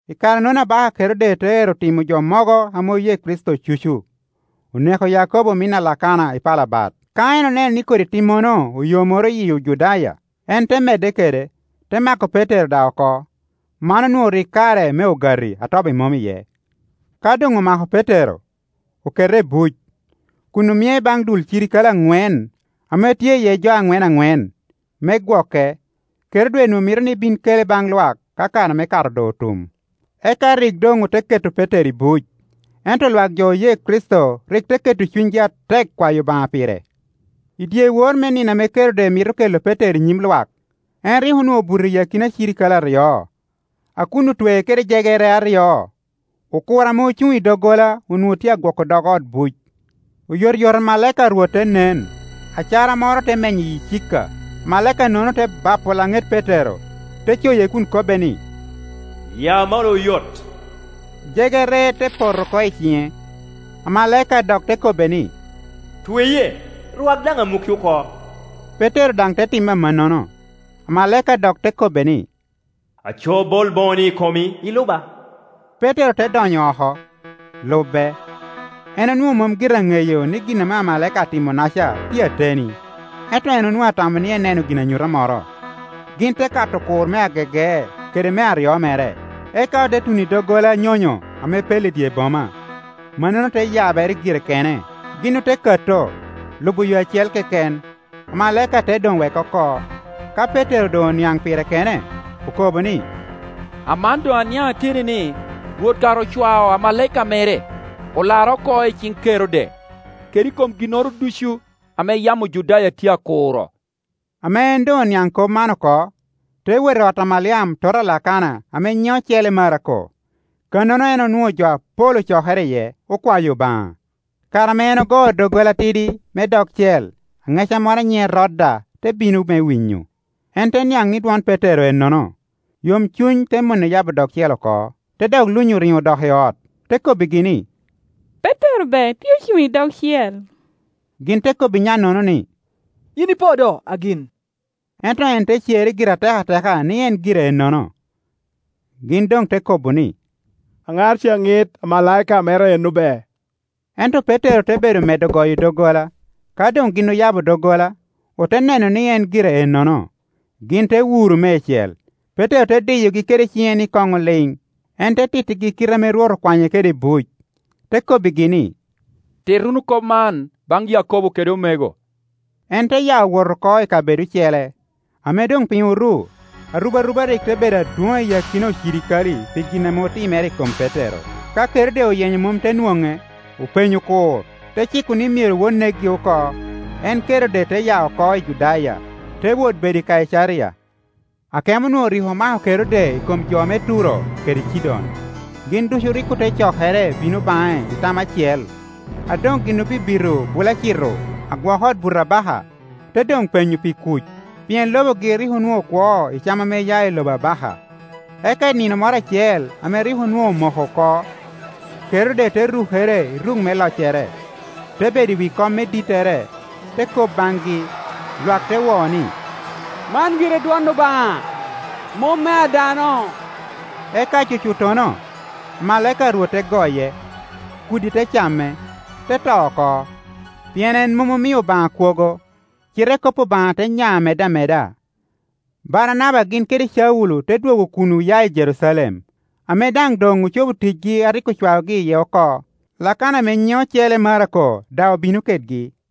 I kare-nono abaka Kerode te ero timo jo mogo ame oye Kricito cucu. Oneko Yakobo omin a Lakana i pala bat. Ka en oneno ni kodi timmono oyomoro yi Ojudaya, en te medde kede, te mako Petero daŋ oko. Man onwoŋo rik kare me Ogati a Tobi Mom iye. Ka doŋomako Petero, okete buc, kun omie baŋ dul cirikale aŋwen, ame tye iye jo aŋwen aŋwen, me gwoke. Kerode onwoŋo mito ni bin kele baŋ lwak ka kare me Kato doŋ otum. Eka rik doŋ ote keto Petero i buc, ento lwak jo oye Kricito rik te keto cunygi atek kwayo Obaŋa pire. I dyewor me nino ame Kerode mito kela Petero i nyim lwak, en rik onwoŋo obuto i akina cirikale aryo, a kun otwee kede jegere aryo, okur ame ocuŋ i doggola onwoŋo tye agwoko dog ot buc. Oyotoyot amalaika a Rwot te nen, acara moro te menyo icika. Amalaika-nono te bapo laŋet Petero, te coye kun kobbe ni, “Ya malo oyot.” Jegere te poto oko i ciŋe. Amalaika dok te kobbe ni, “Tweye, rwak daŋ amukki oko,” Petero daŋ te timo amannono, amalaika dok te kobbe ni, “Aco bol boŋoni i komi, iluba.” Petero te donyo oko, lube. En onwoŋo mom gire aŋeyo ni gin ame amalaika atimonaca tye ateni, ento en onwoŋo atamo ni eneno ginanyuta moro. Gin te kato okur me agege kede me aryo mere, eka ote tuno i doggola nyonyo ame pello i dye boma. Mannono te yabere gire kene, gin ote kato, lubo yo acel keken. Amalaika te doŋ weke oko. Ka Petero doŋ oniaŋ pire kene, okobo ni, “Aman doŋ aniaŋ ateni ni Rwot kara ocwao amalaika mere, olara oko i ciŋ Kerode, kede i kom ginnoro ducu ame yam Ojudaya tye akuro.” Ame en doŋ oniaŋ kop man oko, te wot i ot a Maliam tota a Lakana ame nyiŋe ocele Marako, kannono en onwoŋo jo apol ocokere iye, okwayo Obaŋa. Kare ame en ogoo doggola atidi me dogcel, aŋeca moro a nyiŋe Roda te bino me winyo. En te niaŋ ni dwon Petero ennono, yomcuny te mone yabo dogcel oko, te dok lunyo riŋo dok i ot, te kobbigi ni, “Petero be tye ocuŋ i dogcel.” Gin te kobbi nyannono ni, “Yin ipo do, agin.” Ento en te cerre gire atekateka ni en gire ennono. Gin doŋ te kobo ni, “Aŋar ca ŋit amalaika mere eno be!” Ento Petero te bedo medde goyo doggola. Ka doŋgin oyabo doggola, ote neno ni en gire ennono, gin te wuro miecel. Petero te diyogi kede ciŋe ni koŋ oliŋ, en te tittegi kite ame Rwot okwanye kede i buc. Te kobbigi ni, “Tit wunu kop man baŋ Yakobo kede omego.” En te ya wot oko i kabedo ocele. Ame doŋ piny oru, arubaruba rik te bedo adwoŋ i akina ocirikale pi gin ame otimere i kom Petero. Ka Kerode oyenye mom te nwoŋe, openyo okur, te ciko ni myero wot nekgi oko. En Kerode te ya oko i Judaya, te wot bedo i Kaicaria. Akemo onwoŋo rik omako Kerode i kom jo me Turo kede Cidon. Gin ducu rik ote cokere bino baŋe i tam acel. A doŋ gin obibito Bulacito agwok ot buto abaka, ote doŋ penyo pi kuc, pien lobogi rik onwoŋo kwo i cam a ya i lobo abaka. Eka i nino moro acel ame rik onwoŋo omoko oko. Kerode te rukere i ruk me loccere, te bedo i wi kom me dittere, te kop baŋgi. Lwak te wo ni, “Man gire dwon obaŋa, mom mea dano!” Eka cucuttono, amalaika a Rwot te goye, kudi te came, te to oko; pien en mom omio Obaŋa kwogo. Cite kop Obaŋa te nya medde ameda. Baranaba gin kede Caulo te dwogo kun oya i Jerucalem, ame daŋ doŋ ocobo ticgi a rik ocwaogi iye oko. Lakana ame nyiŋe ocele Marako daŋ obino kedgi.